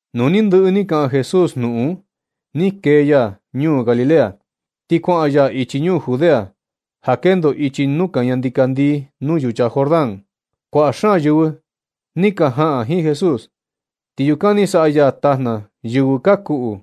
Nu ni ndɨꞌɨ ni kaꞌan Jesús jnuꞌun un, ni kee ya ñuu Galilea, ti kuaꞌan ya ichi ñuu Judea ja kendo ichi nuu kaña ndikandii, nuu yucha Jordán. Kuaꞌa xaan yɨvɨ ni ka jaꞌan jiin Jesús, ti yukan ni saꞌa ya tajna yɨvɨ ka kuꞌu.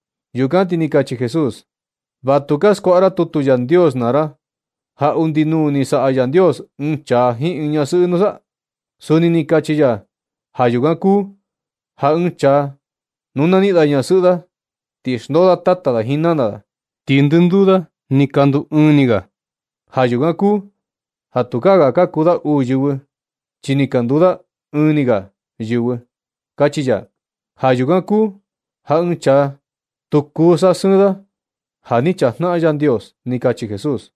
Yukan ti ni kachi Jesús: ―¿Va tu ka skuaꞌa ra tutu Yandios naa ra, ja undi nuu ni saꞌa Yandios ɨɨn chaa jiin ɨɨn ñasɨꞌɨ nusa? Suni ni kachi ya: “Ja yukan kuu ja ɨɨn chaa nuu na niꞌin da ñasɨꞌɨ da, ti xndoo da tata da jiin nana da, ti ndɨnduu da ni ka nduu ɨɨn ni ga. Ja yukan kuu ja tukaa ga ka kuu da uu yɨvɨ, chi ni ka nduu da ɨɨn ni ga yɨvɨ”, kachi ya. Ja yukan kuu ja ɨɨn chaa, tu kuu saꞌa sɨɨn da ja ni chajnaꞌan Yandios ―ni kachi Jesús.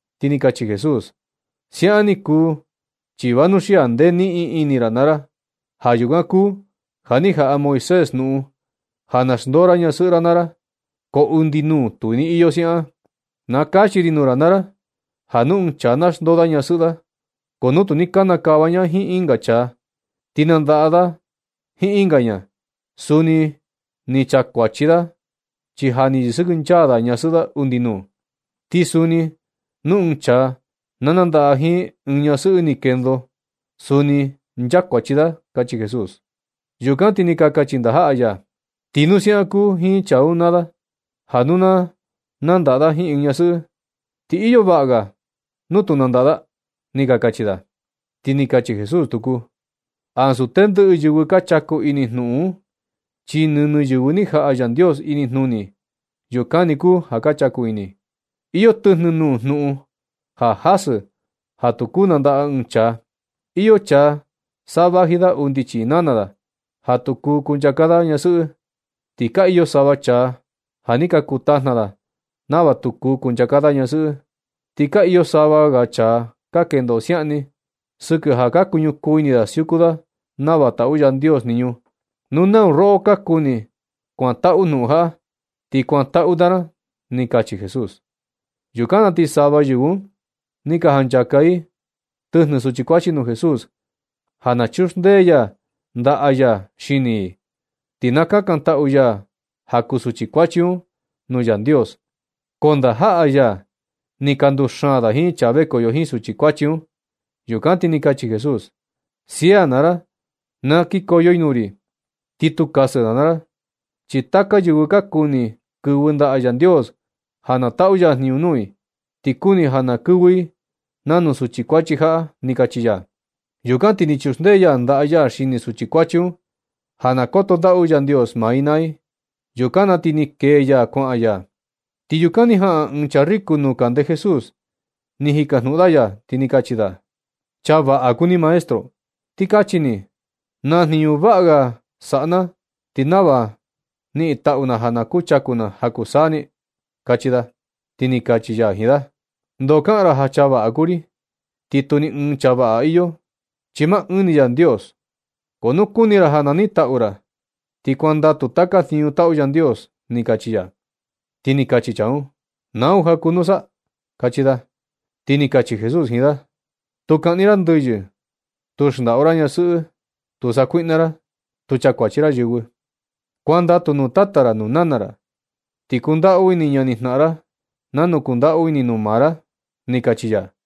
Ti ni kachi Jesús: ―Siaꞌan ni kuu, chi vanuxia ndee niꞌin ini ra naa ra. Ja yukan kuu ja ni jaꞌa Moisés jnuꞌun ja na xndoo ra ñasɨꞌɨ ra naa ra, ko undi nuu tu ni iyo siaꞌan. Na kachi ri nuu ra naa ra, ja nu ɨɨn chaa na xndoo da ñasɨꞌɨ da, ko nu tu ni kanakava ña jiin ɨnga chaa, ti nandaꞌa da jiin ɨnga ña, suni ni nchakuachi da, chi ja ni yɨsɨkɨnchaa da ñasɨꞌɨ da undi nuu. Ti suni nu ɨɨn chaa na nandaꞌa jiin ɨɨn ñasɨꞌɨ ni kendo, suni ni nchakuachi da ―kachi Jesús. Yukan ti ni ka kachi ndajaꞌa ya: ―Ti nu siaꞌan kuu jiin chaa un naa da ja nu na nandaꞌa da jiin ɨɨn ñasɨꞌɨ, ti iyo vaꞌa ga nu tu nandaꞌa da ―ni ka kachi da. Ti ni kachi Jesús tuku: ―Ansu tendɨꞌɨ yɨvɨ ka chaku ini jnuꞌun un, chi nɨnɨ yɨvɨ ni jaꞌa Yandios inijnuni, yukan ni kuu ja ka chaku ini. Iyo tɨjnɨ nuu jnuꞌun ja jasɨ ja tu kuu nandaꞌa ɨɨn chaa. Iyo chaa sa vaji da undi chii nana da ja tu kuu kunchaka da ñasɨꞌɨ. Ti ka iyo sava chaa ja ni ka kuu tajna da nava tu kuu kunchaka da ñasɨꞌɨ. Ti ka iyo sava ga chaa ka kendo siaꞌan ni, sɨkɨ ja ka ñukuu ini da siuku da nava taꞌu Yandios jniñu. Nau roꞌo ka kuni kuantaꞌu jnuꞌun jaꞌa, ti kuantaꞌu ra naa ra ―ni kachi Jesús. Yukan na ti sava yɨvɨ un ni ka janchaka i tɨjnɨ suchi kuachi nuu Jesús ja na chuxndee ya ndaꞌa ya xini i, ti na kakantaꞌu ya ja kuu suchi kuachi un nuu Yandios. Ko ndajaꞌa ya ni ka nduxaan da jiin chaa vekoyo jiin suchi kuachi un. Yukan ti ni kachi Jesús: ―Sia naa ra na kikoyo i nuu ri, ti tu kasɨ ra naa ra. Chi taka yɨvɨ ka kuni kɨvɨ ndaꞌa Yandios ja na taꞌu ya jniñu nuu i, ti kuni ja na kɨvɨ i nanu suchi kuachi jaꞌa ―ni kachi ya. Yukan ti ni chuxndee ya ndaꞌa ya xini suchi kuachi un ja na koto ndaꞌu Yandios maa i naa i. Yukan na ti ni kee ya kuaꞌan ya. Ti yukan ni jaꞌan ɨɨn chaa riku nuu kande Jesús, ni jikajnuꞌun da ya, ti ni kachi da: ―Chaa vaꞌa kuu ni, maestro. Ti kachi ni, ¿naa jniñu vaꞌa saꞌa na ti nava niꞌin taꞌu na ja na kuchaku na ja kuu saa ni? ―kachi da. Ti ni kachi ya jiin da: ―¿Ndoo kaꞌan ra ja chaa vaꞌa kuu ri, ti tu ni ɨɨn chaa vaꞌa iyo, chi maa ɨɨn ni Yandios? Ko nu kuni ra ja na niꞌin taꞌu ra, ti kuandatu taka jniñu taꞌu Yandios ―ni kachi ya. Ti ni kachi chaa un: ―¿Nau ja kuu nusa? ―kachi da. Ti ni kachi Jesús jiin da: ―Tu kaꞌni ra ndɨyɨ, tu xndaꞌu ra ñasɨꞌɨ, tu sakuiꞌna ra, tu chakuachi ra yɨvɨ, kuandatu nuu tata ra nuu nana ra, ti kundaꞌu ini ñanijnaꞌan ra nanu kundaꞌu ini ra nuu maa ra ―ni kachi ya.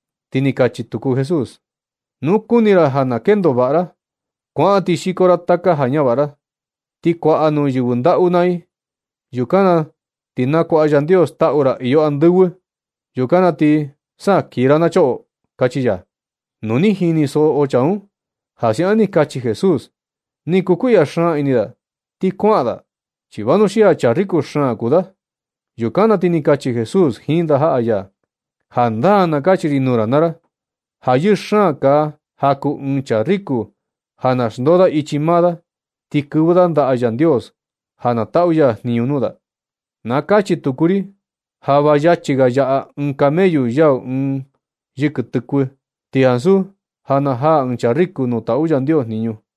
Ti ni kachi tuku Jesús: ―Nu kuni ra ja na kendo vaꞌa ra, kuaꞌan ti xiko ra taka ja ñavaꞌa ra, ti kuaꞌa nuu yɨvɨ ndaꞌu naa i. Yukan na ti na kuaꞌa Yandios taꞌu ra iyo andɨvɨ. Yukan na ti sa kii ra na choꞌo ―kachi ya. Nu ni jinisoꞌo chaa un ja siaꞌan ni kachi Jesús, ni kukuiꞌya xaan ini da ti kuaꞌan da, chi vanuxia chaa riku xaan kuu da. Yukan na ti ni kachi Jesús jiin ndajaꞌa ya: ―Jandaa na kachi ri nuu ra naa ra, ja yɨɨ xaan kaa ja kuu ɨɨn chaa riku ja na xndoo da ichi maa da, ti kɨvɨ da ndaꞌa Yandios ja na taꞌu ya jniñu nuu da. Na kachi tuku ri ja va yachi ga yaꞌa ɨɨn camellu yau ɨɨn yɨkɨ tɨkuɨ, ti ansu ja najaa ɨɨn chaa riku nuu taꞌu Yandios jniñu.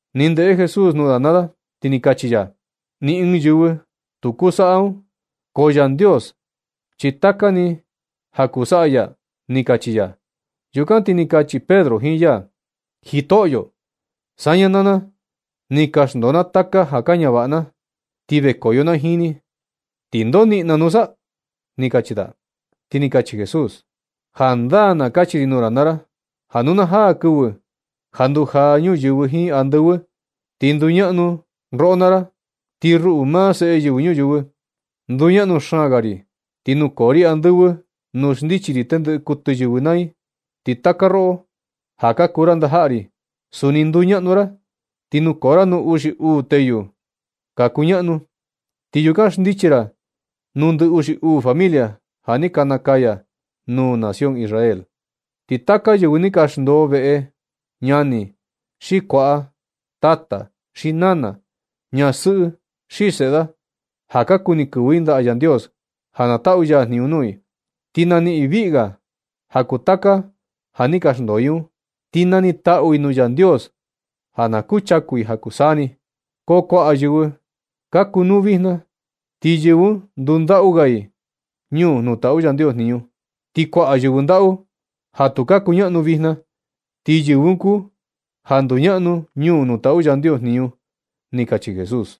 Ni ndeꞌe Jesús nuu da naa da, ti ni kachi ya: ―Ni ɨɨn yɨvɨ tu kuu saꞌa un, ko Yandios, chi taka ni, ja kuu saꞌa ya ―ni kachi ya. Yukan ti ni kachi Pedro jiin ya: ―Jitoꞌyo, saña naa na, ni ka xndoo na taka ja ka ñavaꞌa na ti vekoyo na jiin ni, ¿ti ndoo niꞌin na nusa? ―kachi da. Ti ni kachi Jesús: ―Jandaa na kachi ri nuu ra naa ra, ja nu na jaa kɨvɨ ja ndujaa ñuyɨvɨ jiin andɨvɨ, ti nduñaꞌnu roꞌo naa ra. Ti ruꞌu, maa Seꞌe Yɨvɨ Ñuyɨvɨ, nduñaꞌnu xaan ga ri, ti nukoo ri andɨvɨ nuu xndichi ri tendɨꞌɨ kuɨtɨ yɨvɨ naa i. Ti taka roꞌo ja ka kuu ra ndajaꞌa ri, suni nduñaꞌnu ra, ti nukoo ra nuu uxi uu teyu ka kuñaꞌnu. Ti yukan xndichi ra nuu ndɨ uxi uu familia ja ni ka nakaya nuu nación Israel. Ti taka yɨvɨ ni ka xndoo veꞌe ñani, xi kuaꞌa, tata xi nana, ñasɨꞌɨ xi seꞌe da, ja ka kuni kɨvɨ i ndaꞌa Yandios ja na taꞌu ya jniñu nuu i, ti naniꞌin i viꞌi ga ja kuu taka ja ni ka xndoo i un. Ti nanitaꞌu i nuu Yandios ja na kuchaku i ja kuu saa ni. Ko kuaꞌa yɨvɨ ka kunuu un vijna, ti yɨvɨ un ndundaꞌu ga i ñuu nuu taꞌu Yandios jniñu. Ti kuaꞌa yɨvɨ ndaꞌu ja tu ka kuñaꞌnu vijna, ti yɨvɨ un kuu ja nduñaꞌnu ñuu nuu taꞌu Yandios jniñu ―kachi Jesús.